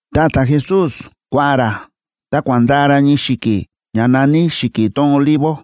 Ta ta̱Jesús kua̱ꞌa̱n ra, ta kua̱ꞌa̱n ndaa ra ñii xi̱ki̱ ña na̱ní Xi̱ki̱ tón Olivo.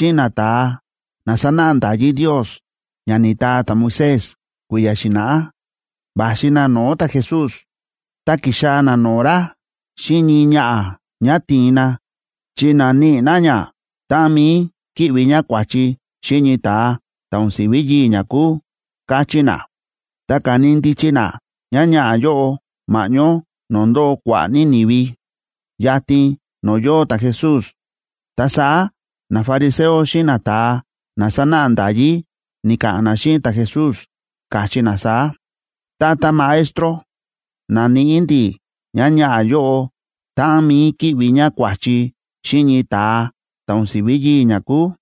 Ta saá sava nafariseo xíꞌin nata̱a na sánáꞌa nda̱yí Ndios ña ni̱taa ta̱Moisés kui̱ya̱ xi̱na̱ꞌá, va̱xi na no̱o̱ ta̱Jesús. Ta ki̱xaa̱ na no̱o̱ ra xíꞌin ñii ñaꞌa̱, ñá ti̱in na, chi na̱níꞌi na ñá táꞌan mi̱i kíꞌvi ñá kua̱chi xíꞌin ñii ta̱a ta̱ o̱n si̱ví yii̱ ñá kúu, káchí na. Ta ka̱ni ndichi na ñáñaꞌa̱ yóꞌo ma̱ꞌñó no̱o̱ ndóo kua̱ꞌa̱ ní ni̱vi, yatin no̱o̱ yóo ta̱Jesús. Ta saá nafariseo xíꞌin nata̱a na sánáꞌa nda̱yí ni̱ka̱ꞌa̱n na xíꞌin ta̱Jesús, káchí na saá: ―Tata Maestro, na̱níꞌi ndi̱ ñáñaꞌa̱ yóꞌo táꞌan mi̱i kíꞌvi ñá kua̱chi xíꞌin ñii ta̱a ta̱ o̱n si̱ví yii̱ ñá kúu.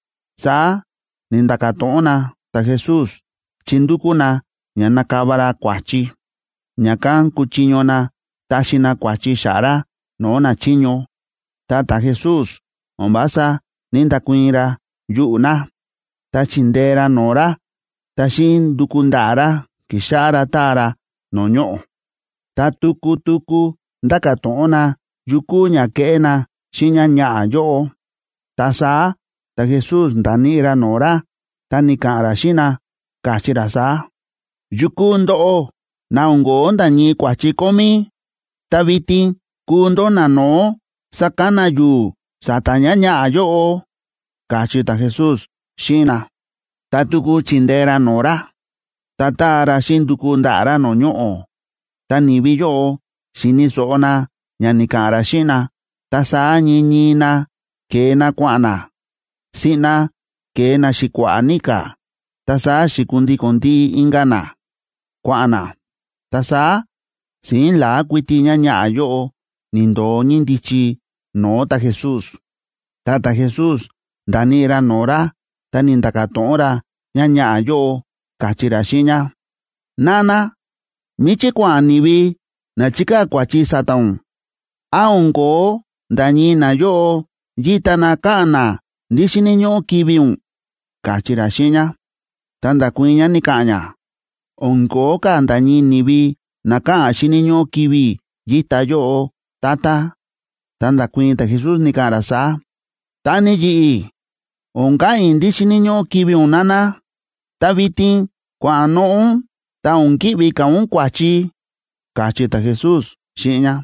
Saá ni̱nda̱ka̱ to̱ꞌon na ta̱Jesús chi ndúkú na ña nakava ra kua̱chi, ña̱kán kuchiño na taxi na kua̱chi xa̱ꞌa̱ ra no̱o̱ nachiño. Ta ta̱Jesús o̱n vása ní‑ndakuii̱n ra yuꞌu̱ na, ta chi̱ndee ra no̱o̱ ra, ta xíꞌin nduku ndaꞌa̱ ra, ki̱xáꞌá ra táa ra no̱o̱ ñoꞌo̱. Ta tuku tuku ndáka̱ to̱ꞌon na yu kúu ña keꞌé na xíꞌin ñáñaꞌa̱ yóꞌo. Ta saá ta̱Jesús nda̱níꞌi ra no̱o̱ ra, ta ni̱ka̱ꞌa̱n ra xíꞌin na, káchí ra saá: ―Yukú ndóꞌó na o̱n ko̱ó nda̱ ñii kua̱chi kómí, ta vitin kuu ndó nano̱ó sakana yu̱u̱ sa̱ta̱ ñáñaꞌa̱ yóꞌo ―káchí ta̱Jesús xíꞌin na. Ta tuku chi̱ndee ra no̱o̱ ra, ta ta̱a ra xíꞌin nduku ndaꞌa̱ ra no̱o̱ ñoꞌo̱. Ta ni̱vi yóꞌo xi̱ni̱ so̱ꞌo na ña ni̱ka̱ꞌa̱n ra xíꞌin na, ta saá ñii ñii na ke̱e na kua̱ꞌa̱n na. Siꞌna ke̱e na xi̱kua̱ꞌa̱ ní ka̱, ta saá xi̱kundíko̱n ndiꞌi inka̱ na, kua̱ꞌa̱n na. Ta saá si̱ín la̱á kuiti ñáñaꞌa̱ yóꞌo ni̱ndo̱o ñíndichi no̱o̱ ta̱Jesús. Ta ta̱Jesús nda̱níꞌi ra no̱o̱ ra, ta ni̱nda̱ka̱ to̱ꞌon ra ñáñaꞌa̱ yóꞌo, káchí ra xíꞌin ñá: ―Nana, ¿míchí kua̱ꞌa̱n ni̱vi na chi̱kaa̱ kua̱chi sa̱ta̱ ún? ¿Án o̱n ko̱ó nda̱ ñii nayóꞌo yíta na káꞌa̱n na ndí xíni̱ ñóꞌó kivi̱ ún? ―káchí ra xíꞌin ñá. Ta nda̱kuii̱n ñá, ni̱ka̱ꞌa̱n ñá: ―O̱n ko̱ó ka̱ nda̱ ñii ni̱vi na káꞌa̱n xíni̱ ñóꞌó kivi̱ i̱ yíta yóꞌo, Tata. Ta nda̱kuii̱n ta̱Jesús, ni̱ka̱ꞌa̱n ra saá: ―Ta ni yi̱ꞌi̱, o̱n ka̱ꞌa̱n i̱ ndí xíni̱ ñóꞌó kivi̱ ún, nana. Ta vitin kua̱noꞌo̱ ún, ta o̱n ki̱ꞌvi ka̱ ún kua̱chi ―káchí ta̱Jesús xíꞌin ñá.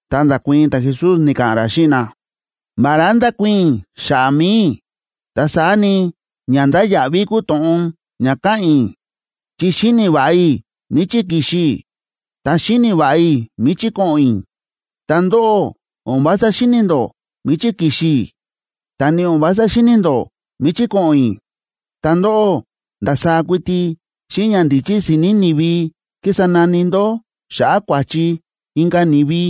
Ta nda̱kuii̱n ta̱Jesús, ni̱ka̱ꞌa̱n ra xíꞌin na: ―Vará ndákuii̱n i̱ xa̱ꞌa̱ mi̱i i̱, ta saá ni, ña ndáya̱ꞌví kúu to̱ꞌon ña káꞌa̱n i̱, chi xíni̱ va̱ꞌa i̱ míchí ki̱xi i̱, ta xíni̱ va̱ꞌa i̱ míchí ko̱ꞌo̱n i̱. Ta ndóꞌó, o̱n vása xíni̱ ndó míchí ki̱xi i̱, ta ni o̱n vása xíni̱ ndó míchí ko̱ꞌo̱n i̱. Ta ndóꞌó, ndasaá kuiti xíꞌin ñandíchí si̱ni̱ ni̱vi kísa nani ndó xa̱ꞌa̱ kua̱chi inka̱ ni̱vi.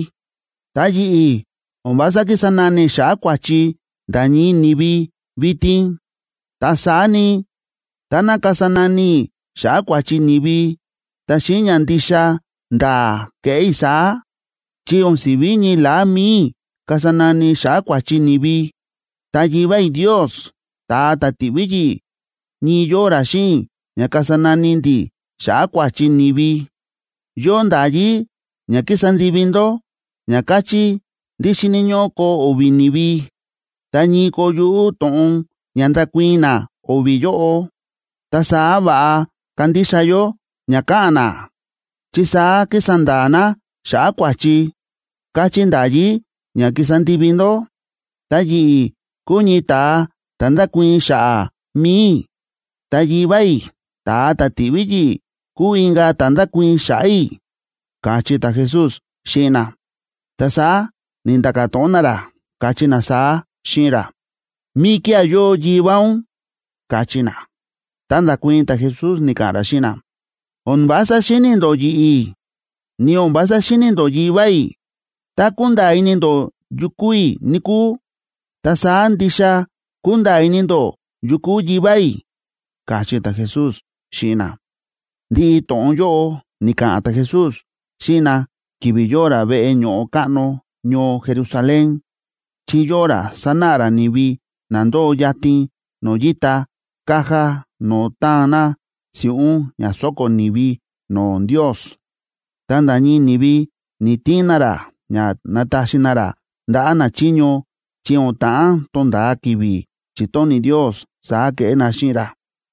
Ta yi̱ꞌi̱, o̱n vása kísa nani i̱ xa̱ꞌa̱ kua̱chi nda̱ ñii ni̱vi vitin. Ta saá ni, táná kasa nani i̱ xa̱ꞌa̱ kua̱chi ni̱vi, ta xíꞌin ña ndixa nda̱a̱ keꞌé i̱ saá. Chi o̱n si̱ví ñii la̱á mi̱i i̱ kasa nani i̱ xa̱ꞌa̱ kua̱chi ni̱vi, ta Yivá i̱ Ndios, ta̱a ta̱ ti̱ꞌví yi̱ꞌi̱, ñii yóo ra xíꞌin i̱ ña kasa nani ndi̱ xa̱ꞌa̱ kua̱chi ni̱vi. Yóo nda̱yí ña kísa ndivi ndó ña káchí ndí xíni̱ ñóꞌó koo o̱vi̱ ni̱vi, tá ñii koo yuꞌú to̱ꞌon ña ndakuii̱n na o̱vi̱ yóꞌo, ta saá va̱ꞌa kandixa yó ña káꞌa̱n na, chi saá kísa nda̱a̱ na xa̱ꞌa̱ kua̱chi, káchí nda̱yí ña kísa ndivi ndó. Ta yi̱ꞌi̱ kúu ñii ta̱a ta̱ ndákuii̱n xa̱ꞌa̱ mi̱i i̱, ta Yivá i̱, ta̱a ta̱ ti̱ꞌví yi̱ꞌi̱, kúu inka̱ ta̱ ndákuii̱n xa̱ꞌa̱ i̱ ―káchí ta̱Jesús xíꞌin na. Ta saá ni̱nda̱ka̱ to̱ꞌon na ra, káchí na saá xíꞌin ra: ―¿Míkía̱ yóo Yivá ún? ―káchí na. Ta nda̱kuii̱n ta̱Jesús, ni̱ka̱ꞌa̱n ra xíꞌin na: ―O̱n vása xíni̱ ndó yi̱ꞌi̱, ni o̱n vása xíni̱ ndó Yivá i̱. Tá kunda̱a̱ ini ndó yu kúu i̱, níkúu, ta saá ndixa kunda̱a̱ ini ndó yu kúu Yivá i̱ ―káchí ta̱Jesús xíꞌin na. Ndiꞌi to̱ꞌon yóꞌo ni̱ka̱ꞌa̱n ta̱Jesús xíꞌin na ki̱vi̱ yóo ra veꞌe ño̱ꞌo káꞌno ñoo Jerusalén, chi yóo ra sánáꞌa ra ni̱vi na ndóo yatin no̱o̱ yíta caja no̱o̱ táan na si̱ꞌún ña sóko̱ ni̱vi no̱o̱ Ndios. Ta nda̱ ñii ni̱vi ni̱‑tiin na ra ña nataxi na ra ndaꞌa̱ nachiño, chi o̱n ta̱ꞌán tonda̱a ki̱vi̱ chitóni̱ Ndios saá keꞌé na xíꞌin ra.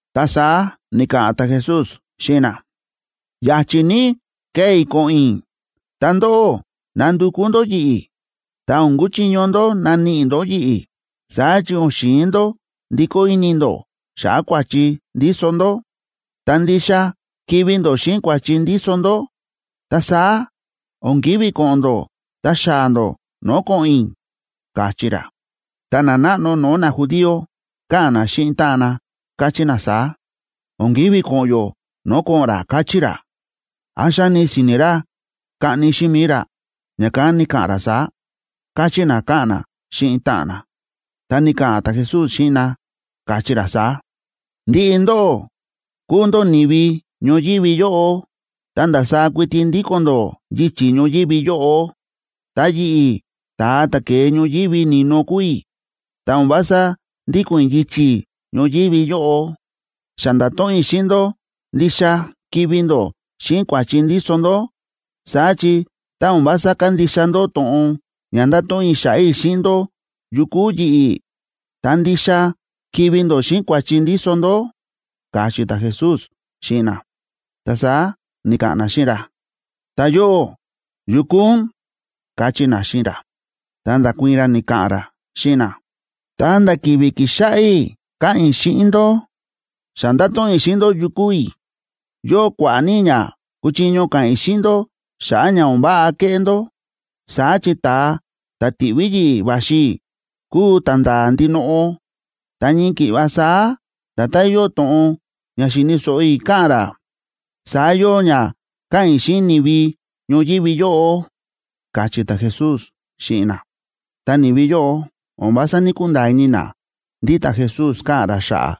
Ta saá ni̱ka̱ꞌa̱n ta̱Jesús xíꞌin na: ―Ya̱chi̱ ní kee i̱ ko̱ꞌo̱n i̱, ta ndóꞌó nandukú ndó yi̱ꞌi̱, ta o̱n kuchiño ndó naníꞌi ndó yi̱ꞌi̱. Saá chi o̱n xi̱in ndó ndikó ini ndó xa̱ꞌa̱ kua̱chi ndíso ndó, ta ndixa kivi̱ ndó xíꞌin kua̱chi ndíso ndó. Ta saá o̱n ki̱ví ko̱ꞌo̱n ndó ta xaa̱ ndó no̱o̱ ko̱ꞌo̱n i̱ ―káchí ra. Ta nanáꞌno no̱o̱ najudío káꞌa̱n na xíꞌin táꞌan na, káchí na saá: ―O̱n ki̱ví ko̱ꞌo̱n yó no̱o̱ ko̱ꞌo̱n ra, káchí ra. ¿Án xáni si̱ni̱ ra kaꞌni xíꞌin mi̱i ra, ña̱kán ni̱ka̱ꞌa̱n ra saá? ―káchí na káꞌa̱n na xíꞌin táꞌan na. Ta ni̱ka̱ꞌa̱n ta̱Jesús xíꞌin na, káchí ra saá: ―Ndiꞌi ndóꞌó kúu ndó ni̱vi ñoyívi yóꞌo, ta ndasaá kuiti ndíko̱n ndó yichi̱ ñoyívi yóꞌo. Ta yi̱ꞌi̱, ta̱a ta̱ ke̱e ñoyívi ni̱no kúu i̱, ta o̱n vása ndíko̱n i̱ yichi̱ ñoyívi yóꞌo. Xa nda̱to̱ꞌon i̱ xíꞌin ndó ndixa kivi̱ ndó xíꞌin kua̱chi ndíso ndó. Saá chi tá o̱n vása kándixa ndó to̱ꞌon ña nda̱to̱ꞌon i̱ xa̱ꞌa̱ i̱ xíꞌin ndó yu kúu yi̱ꞌi̱, ta ndixa kivi̱ ndó xíꞌin kua̱chi ndíso ndó ―káchí ta̱Jesús xíꞌin na. Ta saá ni̱ka̱ꞌa̱n na xíꞌin ra: ―Ta yóꞌó, ¿yu kúu ún? ―káchí na xíꞌin ra. Ta nda̱kuii̱n ra, ni̱ka̱ꞌa̱n ra xíꞌin na: ―Ta nda̱ ki̱vi̱ ki̱xáꞌá i̱ káꞌa̱n i̱ xíꞌin ndó, xa ndáto̱ꞌon i̱ xíꞌin ndó yu kúu i̱. Yóo kua̱ꞌa̱ ní ña kúchiño ka̱ꞌa̱n i̱ xíꞌin ndó xa̱ꞌa̱ ña o̱n váꞌa kéꞌé ndó. Saá chi ta̱a ta̱ ti̱ꞌví yi̱ꞌi̱ va̱xi i̱ kúu ta̱nda̱a̱ ndinoꞌo, ta ñii ki̱ꞌva saá nda̱tán yóo to̱ꞌon ña xíni̱ so̱ꞌo i̱ káꞌa̱n ra, saá yóo ña káꞌa̱n i̱ xíꞌin ni̱vi ñoyívi yóꞌo ―káchí ta̱Jesús xíꞌin na. Ta ni̱vi yóꞌo o̱n vása ní‑kunda̱a̱ ini na ndí ta̱Jesús káꞌa̱n ra xa̱ꞌa̱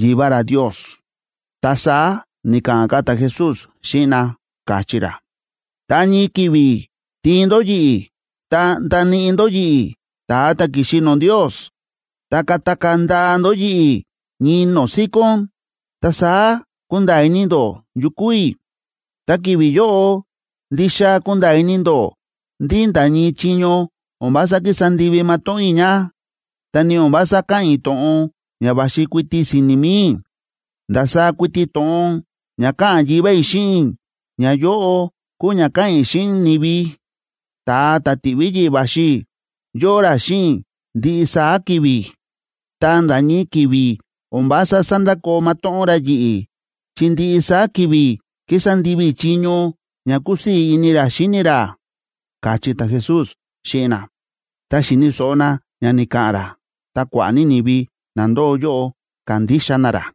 Yivá ra Ndios. Ta saá ni̱ka̱ꞌa̱n ka̱ ta̱Jesús xíꞌin na, káchí ra: ―Ta ñii ki̱vi̱ tiin ndó yi̱ꞌi̱ ta ndaníꞌi ndó yi̱ꞌi̱, ta̱a ta̱ ki̱xi no̱o̱ Ndios, ta katakaa̱ ndaa ndó yi̱ꞌi̱ ñii no̱o̱ síkón. Ta saá kunda̱a̱ ini ndó yu kúu i̱. Ta ki̱vi̱ yóꞌo ndixa kunda̱a̱ ini ndó ndí nda̱ ñii chiño o̱n vása kísa ndivi matóꞌón i̱ ña, ta ni o̱n vása káꞌa̱n i̱ to̱ꞌon ña va̱xi kuiti si̱ni̱ mi̱i i̱. Ndasaá kuiti to̱ꞌon ña káꞌa̱n Yivá i̱ xíꞌin i̱, ñayóꞌo kúu ña káꞌa̱n i̱ xíꞌin ni̱vi. Ta̱a ta̱ ti̱ꞌví yi̱ꞌi̱ va̱xi i̱, yóo ra xíꞌin i̱ ndiꞌi saá ki̱vi̱, ta nda̱ ñii ki̱vi̱ o̱n vása sándakoo matóꞌón ra yi̱ꞌi̱, chi ndiꞌi saá ki̱vi̱ kísa ndivi i̱ chiño ña kúsii̱ ini ra xíni ra ―káchí ta̱Jesús xíꞌin na. Tá xíni̱ so̱ꞌo na ña ni̱ka̱ꞌa̱n ra, ta kua̱ꞌa̱ ní ni̱vi na ndóo yóꞌo ka̱ndixa na ra.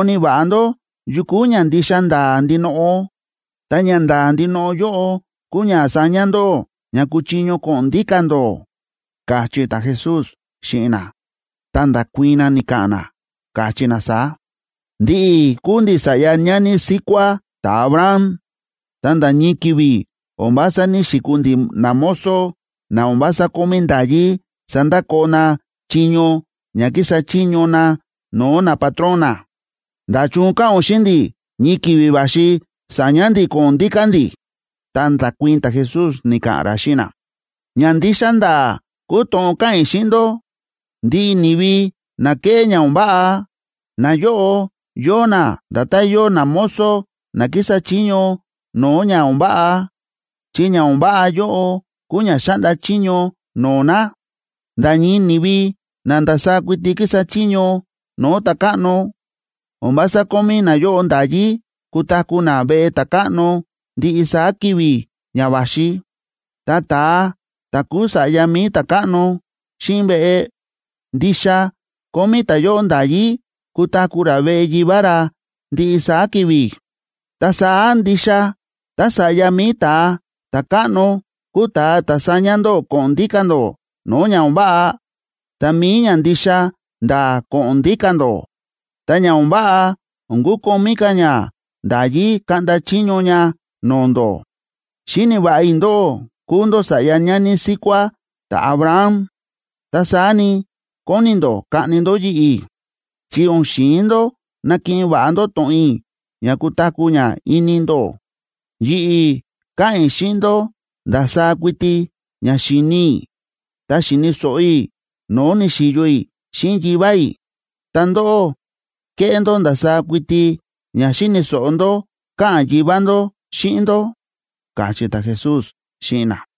Ta saá koni̱ va̱ꞌa ndó yu kúu ña ndixa nda̱a̱ ndinoꞌo, ta ñanda̱a̱ ndinoꞌo yóꞌo kúu ña saña ndó ña kuchiño ko̱ꞌo̱n ndíka̱ ndó ―káchí ta̱Jesús xíꞌin na. Ta nda̱kuii̱n na, ni̱ka̱ꞌa̱n na, káchí na saá: ―Ndi̱ꞌi̱ kúu ndi̱ sa̱ꞌya ñani síkuá ta̱Abraham, ta nda̱ ñii ki̱vi̱ o̱n vása ní‑xikuu ndi̱ namozo na o̱n vása kómí nda̱yí sandakoo na chiño ña kísa chiño na no̱o̱ napatrón na. ¿Nda̱chun káꞌa̱n ún xíꞌin ndi̱ ñii ki̱vi̱ va̱xi sa̱ña̱ ndi̱ ko̱ꞌo̱n ndíka̱ ndi̱? Ta nda̱kuii̱n ta̱Jesús, ni̱ka̱ꞌa̱n ra xíꞌin na: ―Ña ndixa nda̱a̱ kúu to̱ꞌon káꞌa̱n i̱ xíꞌin ndó: Ndiꞌi ni̱vi na kéꞌé ña o̱n váꞌa, nayóꞌo yóo na nda̱tán yóo namozo na kísa chiño no̱o̱ ña o̱n váꞌa, chi ña o̱n váꞌa yóꞌo kúu ña xáꞌnda chiño no̱o̱ na. Nda̱ ñii ni̱vi na ndasaá kuiti kísa chiño no̱o̱ ta̱káꞌno, o̱n vása kómí nayóꞌo nda̱yí kutaku̱ na veꞌe ta̱káꞌno ndiꞌi saá ki̱vi̱ ña va̱xi. Ta ta̱a ta̱ kúu sa̱ꞌya mi̱i ta̱káꞌno xíꞌin veꞌe, ndixa kómí ta̱yóꞌo nda̱yí kutaku̱ ra veꞌe yivá ra ndiꞌi saá ki̱vi̱. Ta saá ndixa tá Sa̱ꞌya mi̱i Ta̱a Ta̱káꞌno kúu ta̱a ta̱ saña ndóꞌó ko̱ꞌo̱n ndíka̱ ndó no̱o̱ ña o̱n váꞌa, ta mi̱i ña ndixa nda̱a̱ ko̱ꞌo̱n ndíka̱ ndó, ta ña o̱n váꞌa o̱n kukomí ka̱ ña nda̱yí kaꞌnda chiño ña no̱o̱ ndó. Xíni̱ va̱ꞌa i̱ ndóꞌó kúu ndó sa̱ꞌya ñani síkuá ta̱Abraham. Ta saá ni, kóni ndó kaꞌni ndó yi̱ꞌi̱, chi o̱n xi̱in ndó nakiꞌin va̱ꞌa ndó to̱ꞌon i̱ ña kutaku̱ ña ini ndó. Yi̱ꞌi̱ káꞌa̱n i̱ xíꞌin ndó ndasaá kuiti ña xi̱ni i̱ ta xi̱ni̱ so̱ꞌo i̱ no̱o̱ ni̱xi̱yo i̱ xíꞌin Yivá i̱. Ta ndóꞌó, kéꞌé ndó ndasaá kuiti ña xíni̱ so̱ꞌo ndó káꞌa̱n yivá ndó xíꞌin ndó ―káchí ta̱Jesús xíꞌin na.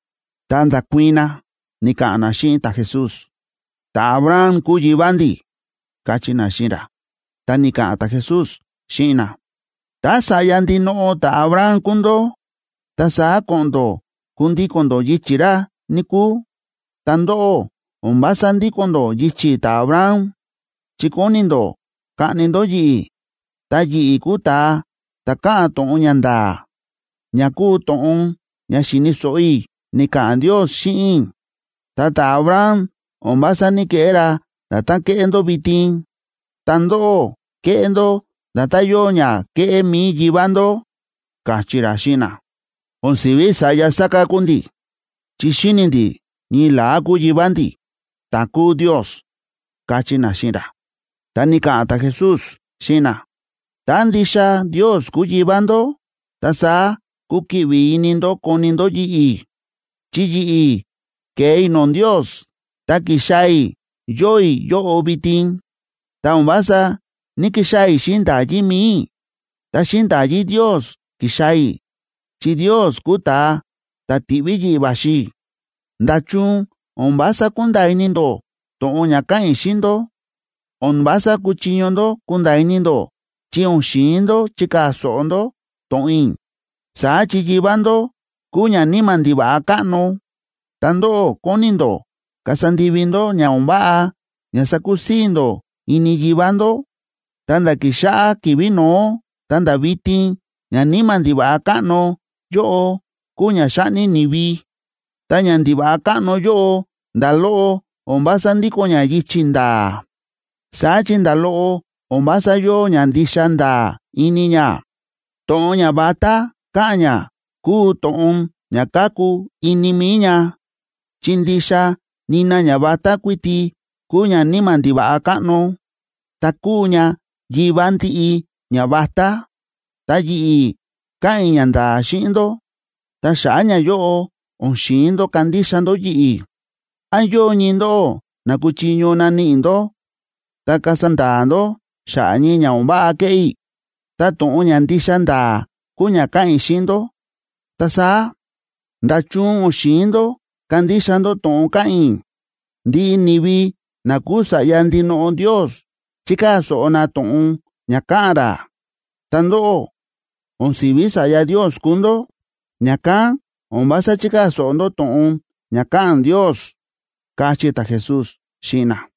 Ta nda̱kuii̱n na, ni̱ka̱ꞌa̱n na xíꞌin ta̱Jesús: ―Ta̱Abraham kúu yivá ndi̱ ―káchí na xíꞌin ra. Ta ni̱ka̱ꞌa̱n ta̱Jesús xíꞌin na: ―Tá sa̱ꞌya ndinoꞌo ta̱Abraham kúu ndó, ta saá ko̱ꞌo̱n ndó kundíko̱n ndó yichi̱ ra, níkúu. Ta ndóꞌó, o̱n vása ndíko̱n ndó yichi̱ ta̱Abraham, chi kóni ndó kaꞌni ndó yi̱ꞌi̱, ta yi̱ꞌi̱ kúu ta̱a ta̱ káꞌa̱n to̱ꞌon ña nda̱a̱, ña kúu to̱ꞌon ña xi̱ni̱ so̱ꞌo i̱ ni̱ka̱ꞌa̱n Ndios xíꞌin i̱. Ta ta̱Abraham, o̱n vása ní‑keꞌé ra nda̱tán kéꞌé ndó vitin. Ta ndóꞌó, kéꞌé ndó nda̱tán yóo ña kéꞌé mi̱i yivá ndó ―káchí ra xíꞌin na. ―O̱n si̱ví sa̱ꞌya sáká kúu ndi̱. Chi xíni̱ ndi̱ ñii la̱á kúu yivá ndi̱, ta̱ kúu Ndios ―káchí na xíꞌin ra. Ta ni̱ka̱ꞌa̱n ta̱Jesús xíꞌin na: ―Tá ndixa Ndios kúu yivá ndó, ta saá kukiꞌvi ini ndó koni ndó yi̱ꞌi̱, chi yi̱ꞌi̱ ke̱e i̱ no̱o̱ Ndios, ta ki̱xaa̱ i̱ yóo i̱ yóꞌo vitin. Ta o̱n vása ní‑kixaa̱ i̱ xíꞌin nda̱yí mi̱i i̱, ta xíꞌin nda̱yí Ndios ki̱xaa̱ i̱, chi Ndios kúu ta̱a ta̱ ti̱ꞌví yi̱ꞌi̱ va̱xi i̱. ¿Nda̱chun o̱n vása kúnda̱a̱ ini ndó to̱ꞌon ña káꞌa̱n i̱ xíꞌin ndó? O̱n vása kúchiño ndó kunda̱a̱ ini ndó chi o̱n xi̱in ndó chikaa̱ so̱ꞌo ndó to̱ꞌon i̱. Saá chi yivá ndó kúu ñaníma̱ ndiva̱ꞌa káꞌno, ta ndóꞌó kóni ndó kasa ndivi ndó ña o̱n váꞌa ña sakusii̱ ndó ini yivá ndó. Ta nda̱ ki̱xáꞌá ki̱vi̱ no̱ó ta̱nda̱ vitin ñaníma̱ ndiva̱ꞌa káꞌno yóꞌo kúu ña xáꞌni ni̱vi. Ta ñandiva̱ꞌa káꞌno yóꞌo, nda̱ loꞌo o̱n vása ndíko̱n ña yichi̱ nda̱a̱, saá chi nda̱ loꞌo o̱n vása yóo ña ndixa nda̱a̱ ini ña. To̱ꞌon ñavatá káꞌa̱n ña kúu to̱ꞌon ña káku ini mi̱i ña, chi ndixa nina ñavatá kuiti kúu ñaníma̱ ndiva̱ꞌa káꞌno, ta kúu ña yivá ndiꞌi ñavatá. Ta yi̱ꞌi̱, káꞌa̱n i̱ ñanda̱a̱ xíꞌin ndó, ta xa̱ꞌa̱ ñayóꞌo, o̱n xi̱in ndó kandixa ndó yi̱ꞌi̱. ¿Án yóo ñii ndóꞌó na kúchiño naníꞌi ndó ta kasa nda̱a̱ ndó xa̱ꞌa̱ ñii ña o̱n váꞌa ke̱ꞌé i̱? Tá to̱ꞌon ña ndixa nda̱a̱ kúu ña káꞌa̱n i̱ xíꞌin ndó, ta saá, ¿nda̱chun o̱n xi̱in ndó kandixa ndó to̱ꞌon káꞌa̱n i̱? Ndiꞌi ni̱vi na kúu sa̱ꞌya ndinoꞌo Ndios chíkaa̱ so̱ꞌo na to̱ꞌon ña káꞌa̱n ra. Ta ndóꞌó, o̱n si̱ví sa̱ꞌya Ndios kúu ndó, ña̱kán o̱n vása chíkaa̱ so̱ꞌo ndó to̱ꞌon ña káꞌa̱n Ndios ―káchí ta̱Jesús xíꞌin na.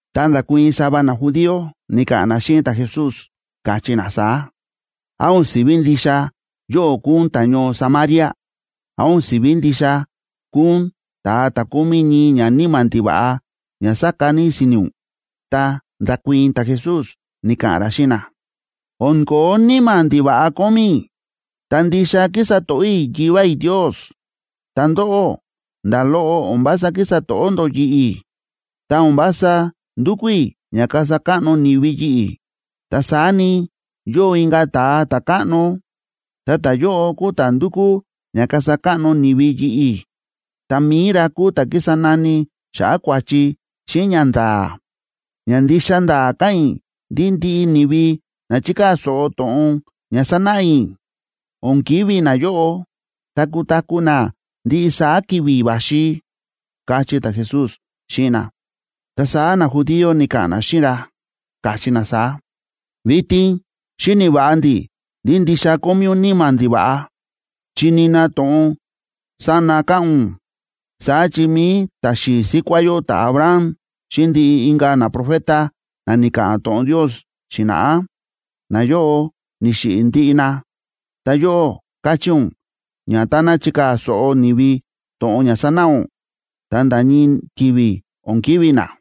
Ta nda̱kuii̱n sava najudío, ni̱ka̱ꞌa̱n na xíꞌin ta̱Jesús, káchí na saá: ―¿Án o̱n si̱ví ndixa yóꞌó kúu ún ta̱ñoo Samaria? ¿Án o̱n si̱ví ndixa kúu ún ta̱a ta̱ kómí ñii ñaníma̱ ndiva̱ꞌa ña sáka ní si̱ni̱ ún? Ta nda̱kuii̱n ta̱Jesús, ni̱ka̱ꞌa̱n ra xíꞌin na: ―O̱n ko̱ó níma̱ ndiva̱ꞌa kómí i̱, ta ndixa kísa to̱ꞌó i̱ Yivá i̱ Ndios. Ta ndóꞌó, nda̱ loꞌo o̱n vása kísa to̱ꞌó ndó yi̱ꞌi̱. Ta o̱n vása ndúkú i̱ ña kasa káꞌno ni̱vi yi̱ꞌi̱. Ta saá ni, yóo inka̱ Ta̱a Ta̱káꞌno, ta ta̱yóꞌo kúu ta̱ ndúkú ña kasa káꞌno ni̱vi yi̱ꞌi̱, ta mi̱i ra kúu ta̱ kísa nani xa̱ꞌa̱ kua̱chi xíꞌin ñanda̱a̱. Ña ndixa nda̱a̱ káꞌa̱n i̱ ndí ndiꞌi ni̱vi na chíkaa̱ so̱ꞌo to̱ꞌon ña sánáꞌa i̱, o̱n kivi̱ nayóꞌo, ta kutaku̱ na ndiꞌi saá ki̱vi̱ va̱xi ―káchí ta̱Jesús xíꞌin na. Ta saá najudío ni̱ka̱ꞌa̱n na xíꞌin ra, káchí na saá: ―Vitin xíni̱ va̱ꞌa ndi̱ ndí ndixa kómí ún níma̱ ndiva̱ꞌa, chi nina to̱ꞌon sána káꞌa̱n ún. Saá chi mi̱i ta̱xi̱i̱ síkuá yó ta̱Abraham xíꞌin ndiꞌi inka̱ naprofeta na ni̱ka̱ꞌa̱n to̱ꞌon Ndios xi̱na̱ꞌá, nayóꞌo ni̱xiꞌi̱ ndiꞌi na. Ta yóꞌó, káchí ún ña táná chikaa̱ so̱ꞌo ni̱vi to̱ꞌon ña sánáꞌa ún, ta nda̱ ñii ki̱vi̱ o̱n kivi̱ na.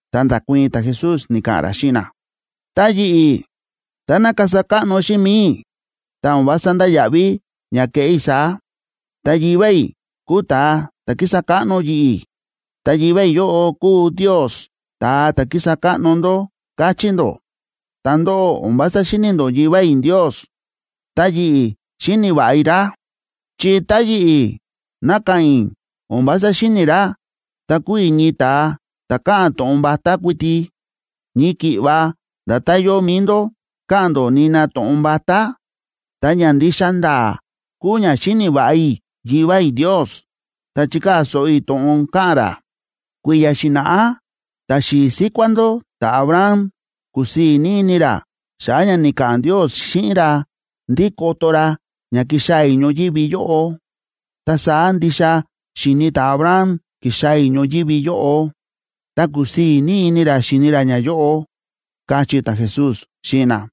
Ta nda̱kuii̱n ta̱Jesús, ni̱ka̱ꞌa̱n ra xíꞌin na: ―Tá yi̱ꞌi̱, táná kasa káꞌno xíꞌin mi̱i i̱, ta o̱n vása ndáya̱ꞌví ña kéꞌé i̱ saá. Ta Yivá i̱ kúu ta̱a ta̱ kísa káꞌno yi̱ꞌi̱, ta Yivá i̱ yóꞌo kúu Ndios ta̱a ta̱ kísa káꞌno ndó, káchí ndó. Ta ndóꞌó, o̱n vása xíni̱ ndó Yivá i̱ Ndios, ta yi̱ꞌi̱ xíni̱ va̱ꞌa i̱ ra. Chi tá yi̱ꞌi̱ ná ka̱ꞌa̱n i̱ o̱n vása xíni̱ i̱ ra, ta kuu i̱ ñii ta̱a ta̱ káꞌa̱n to̱ꞌon vatá kuiti, ñii ki̱ꞌva nda̱tán yóo mi̱i ndó káꞌa̱n ndó nina to̱ꞌon vatá. Ta ña ndixa nda̱a̱ kúu ña xíni̱ va̱ꞌa i̱ Yivá i̱ Ndios ta chíkaa̱ so̱ꞌo i̱ to̱ꞌon káꞌa̱n ra. Kui̱ya̱ xi̱na̱ꞌá ta̱xi̱i̱ síkuá ndó ta̱Abraham kúsii̱ ní ini ra xa̱ꞌa̱ ña ni̱ka̱ꞌa̱n Ndios xíꞌin ra ndí koto ra ña kixaa̱ i̱ ñoyívi yóꞌo. Ta saá ndixa xi̱ni ta̱Abraham ki̱xaa̱ i̱ ñoyívi yóꞌo, ta ku̱sii̱ ní ini ra xi̱ni ra ñayóꞌo ―káchí ta̱Jesús xíꞌin na.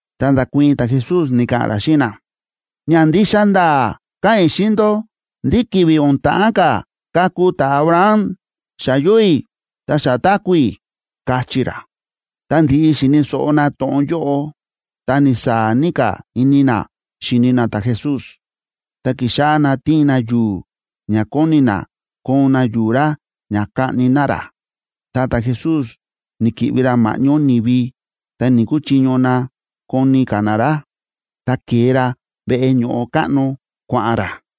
Ta nda̱kuii̱n ta̱Jesús, ni̱ka̱ꞌa̱n ra xíꞌin na: ―Ña ndixa nda̱a̱ káꞌa̱n i̱ xíꞌin ndó ndí ki̱vi̱ o̱n ta̱ꞌán ka̱ kaku ta̱Abraham, xa yóo i̱ ta xa táku̱ i̱ ―káchí ra. Tá ndi̱ꞌi xi̱ni̱ so̱ꞌo na to̱ꞌon yóꞌo, ta ni̱saa̱ ní ka̱ ini na xíni na ta̱Jesús, ta ki̱xáꞌá na tiin na yu̱u̱, ña kóni na koon na yu̱u̱ ra ña kaꞌni na ra. Ta ta̱Jesús ni̱ki̱ꞌvi ra ma̱ꞌñó ni̱vi, ta ni̱‑kuchiño na koni ka̱ na ra, ta ke̱e ra veꞌe ño̱ꞌo káꞌno kua̱ꞌa̱n ra.